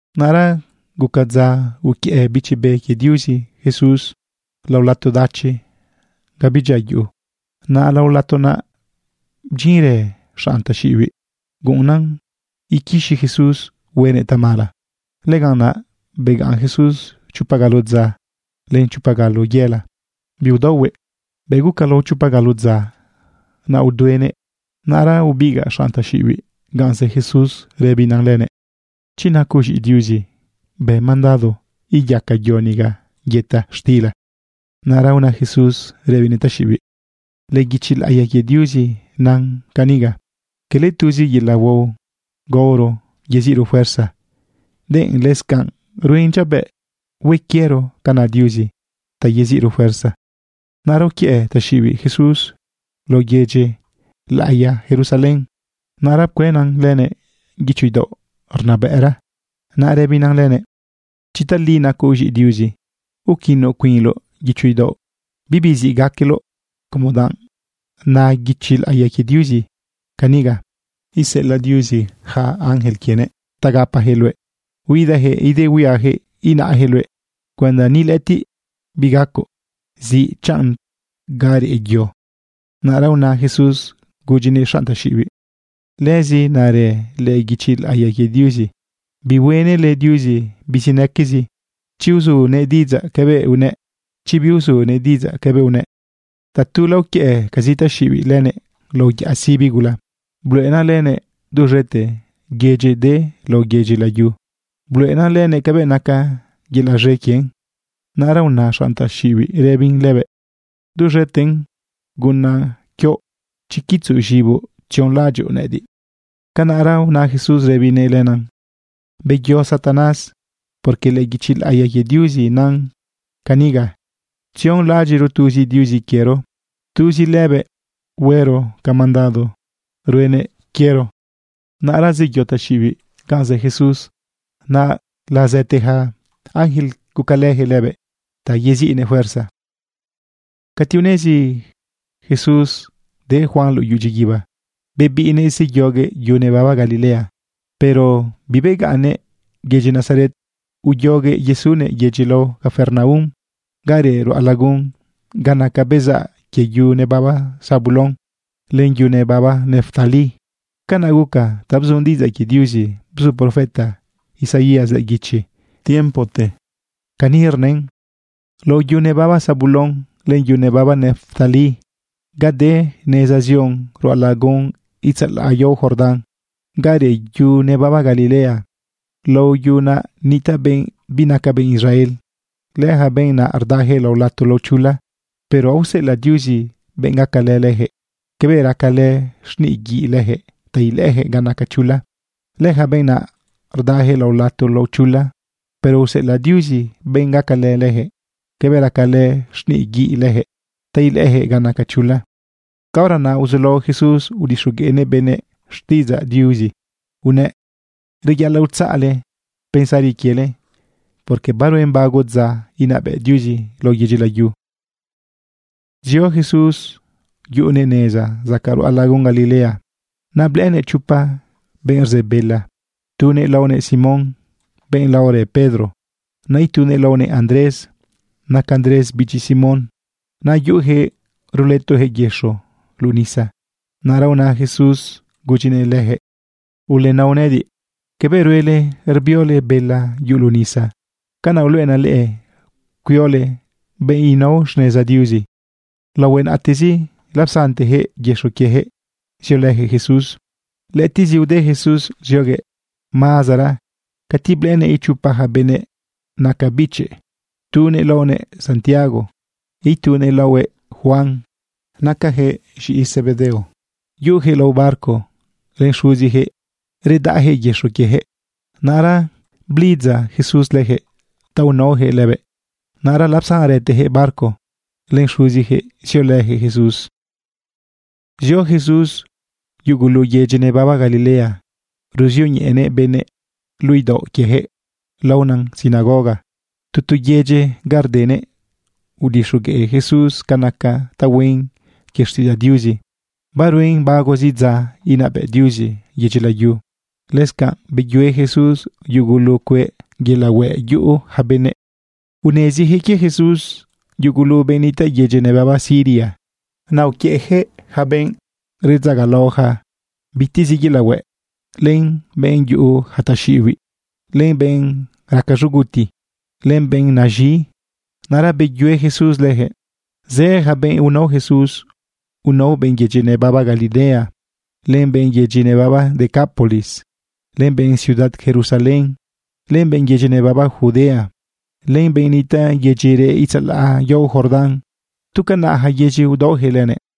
Naꞌra guca dza uquiëꞌ Bichi Be quie Diuzi Jesús lao lato dachi ga bidyia yuꞌu. Naꞌ lao lato naꞌ bdyinrë xanꞌ taxiꞌibiꞌ guꞌunna iquixi Jesús huenëꞌ tamala. Lëganꞌ naꞌ begaꞌn Jesús chopa galo dza len chopa galo yela, biudaohuëꞌ. Bëꞌ guca lao chopa galo dza, naꞌ uduenëꞌ. Naꞌra ubigaꞌ xanꞌ taxiꞌibiꞌ ganꞌ zë Jesús rëbina lënëꞌ: ―Chi nacoꞌ z̃iꞌi Diuzi, bë mandado iyaca yo niga yëta xtila. Naꞌra una Jesús rëbinëꞌ taxiꞌibiꞌ: ―Lëꞌë guichi laꞌiya quie Diuzi nan ca niga: “Quele tuzi yelaꞌ huao gaoro yeziꞌro fuerza, denꞌ lëscanꞌ ruen dyiabëꞌ hue quiero ca na Diuzi ta yeziꞌro fuerza.” Naꞌra uquiëꞌ taxiꞌibiꞌ Jesús lao yedyi laꞌiya Jerusalén. Naꞌra pcuëna lënëꞌ guicho idaoꞌ rnabëꞌra. Naꞌ rëbinan lënëꞌ: ―Chi tali nacoꞌ z̃iꞌi Diuzi, uquino cuinloꞌ guicho idaoꞌ. Bibi ziꞌ gaqueloꞌ, como danꞌ na guichi laꞌiya quie Diuzi ca niga: Iseꞌelaꞌ Diuzi yaca ángel quienëꞌ ta gapajëꞌ luëꞌ. Huidajëꞌ idehuia inaꞌjëꞌ luëꞌ cuenda ni lëꞌëtiꞌ bigacoꞌ ziꞌ chanꞌ naꞌ ga reꞌ yo. Naꞌra una Jesús gudyinëꞌ xanꞌ taxiꞌibiꞌ: ―Lëzi narë lëꞌë guichi laꞌiya quie Diuzi: “Bihuenële Diuzi bizinaquezi chi uzunëꞌ diꞌidzaꞌ cabëꞌ unëꞌ, chi biuzunëꞌ diꞌidzaꞌ cabëꞌ unëꞌ.” Tatula uquiëꞌcazi taxiꞌibiꞌ lënëꞌ lao yaꞌa sibi gula. Bluꞌenan lënëꞌ duz̃ete yedyi de lao yedyi layu. Bluꞌenan lënëꞌ cabëꞌ naca yelaꞌ z̃e quien. Naꞌra una xanꞌ taxiꞌibiꞌ rëbin lënëꞌ: ―Duz̃eten gunaꞌ quioꞌ chi quitzoꞌ z̃iboꞌ tzionlaꞌadyoꞌ nëꞌëdiꞌ. Canaꞌra una Jesús rëbinëꞌ lënan: ―Beyo, Satanás, porque lëꞌë guichi laꞌiya quie Diuzi nan caniga: “Tzionlaꞌadyiꞌro tuzi Diuzi quiero. Tuzi lëbëꞌ huero ca mandado ruenëꞌ quiero.” Naꞌra zeyo taxiꞌibiꞌ ganꞌ zë Jesús. Naꞌ lazaꞌte ja ángel, gucalëjëꞌ lëbëꞌ ta yeziꞌnëꞌ fuerza. Cati unezi Jesús de Juan luꞌu dyiguiba, bebiꞌnëꞌ zeyoguëꞌ yu nebaba Galilea. Pero bibegaꞌnnëꞌ yedyi Nazaret, uyoguëꞌ yesunëꞌ yedyi lao Capernaum ga reꞌ ruꞌa lagun ga naca bezaꞌ quie yu nebaba Zabulón len yu nebaba Neftalí. Canaꞌ guca ta bzu diꞌidzaꞌ quie Diuzi bzu profeta Isaías lëꞌë guichi tiempote. Cani rnën: Lao yu nebaba Zabulón len yu nebaba Neftalí, ga de neza zion ruꞌa lagun itzalaꞌ yao Jordán, ga reꞌ yu nebaba Galilea, lao yu naꞌ nitaꞌ benꞌ binaca benꞌ Israel. Lëja benꞌ naꞌ rdajëꞌ lao lato lao chula, pero aoseꞌelaꞌ Diuzi benꞌ gacalë lëjëꞌ cabëꞌ racalë xniꞌ guiꞌ lëjëꞌ ta ilëꞌëjëꞌ ga naca chula. Lëja benꞌ naꞌ rdajëꞌ lao lato lao chula, pero useꞌelaꞌ Diuzi benꞌ gacalë lëjëꞌ cabëꞌ racalë xniꞌ guiꞌ lëjëꞌ ta ilëꞌëjëꞌ ga naca chula. Caora naꞌ uzulao Jesús udixogueꞌnëꞌ benëꞌ xtiꞌidzaꞌ Diuzi unëꞌ: ―Reyaꞌalaꞌ utzaꞌle pensari quiele, porque baruen bago dza inabëꞌ Diuzi lao yedyi layu. Zio Jesús yuꞌunëꞌ neza zacaꞌ ruꞌa lagun Galilea. Naꞌ blëꞌënëꞌ chopa benꞌ rze bela. Tunëꞌ laonëꞌ Simón, benꞌ laorë Pedro. Naꞌ itunëꞌ laonëꞌ Andrés. Naca Andrés bichi Simón. Naꞌ yuꞌujëꞌ rulëtojëꞌ yëxo luꞌu nisa. Naꞌra una Jesús gudyinëꞌ leyaquëꞌ: ―Ulenao nëꞌëdiꞌ. Cabëꞌ ruele cuiole bela yuꞌu luꞌu nisa, canaꞌ uluꞌenaꞌ leꞌe cuiole benꞌ nao xneza Diuzi. Laohue naꞌtezi lapsantejëꞌ yëxo quiejëꞌ ziolëjëꞌ Jesús. Lëꞌëtiꞌzi ude Jesús zioguëꞌ mazara cati blëꞌënëꞌ ichopa ja benëꞌ naca bichëꞌ. Tunëꞌ laonëꞌ Santiago, itunëꞌ laonëꞌ Juan. Nacayaquëꞌ z̃iꞌi Zebedeo. Yuꞌujëꞌ lao barco len xuzijëꞌ rudaꞌjëꞌ yëxo quiejëꞌ. Naꞌra blidza Jesús lëjëꞌ ta unaojëꞌ lëbëꞌ. Naꞌra lapsanrëtejëꞌ barco len xuzijëꞌ ziolëjëꞌ Jesús. Zio Jesús yugulu yedyi nebaba Galilea. Ruzioñeꞌenëꞌ benëꞌ luꞌu idaoꞌ quiejëꞌ laonan sinagoga tu tu yedyi ga rdenëꞌ. Udixogueꞌ Jesús ca naca tahuen quie xtiꞌidzaꞌ Diuzi baruen bagozi dza inabëꞌ Diuzi yedyi layu. Lëscanꞌ beyue Jesús yugulu cueꞌ yelaꞌ hueꞌ yuꞌu ja benëꞌ. Nezijëꞌ quie Jesús yugulu benꞌ nitaꞌ yedyi nebaba Siria. Naꞌ uquiëꞌjëꞌ yaca benꞌ redzagalaoja bitezi yelaꞌ hueꞌ, len benꞌ yuꞌu ja taxiꞌibiꞌ, len benꞌ raca z̃uguti, len benꞌ naz̃i. Naꞌra beyue Jesús lëjëꞌ. Zë ja benꞌ unao Jesús. Unao benꞌ yedyi nebaba Galilea, len benꞌ yedyi nebaba Decápolis, len benꞌ ciudad Jerusalén, len benꞌ yedyi nebaba Judea, len benꞌ nitaꞌ yedyi reꞌ itzalaꞌ yao Jordán. Tu canaꞌ ja yedyi udaojëꞌ lënëꞌ.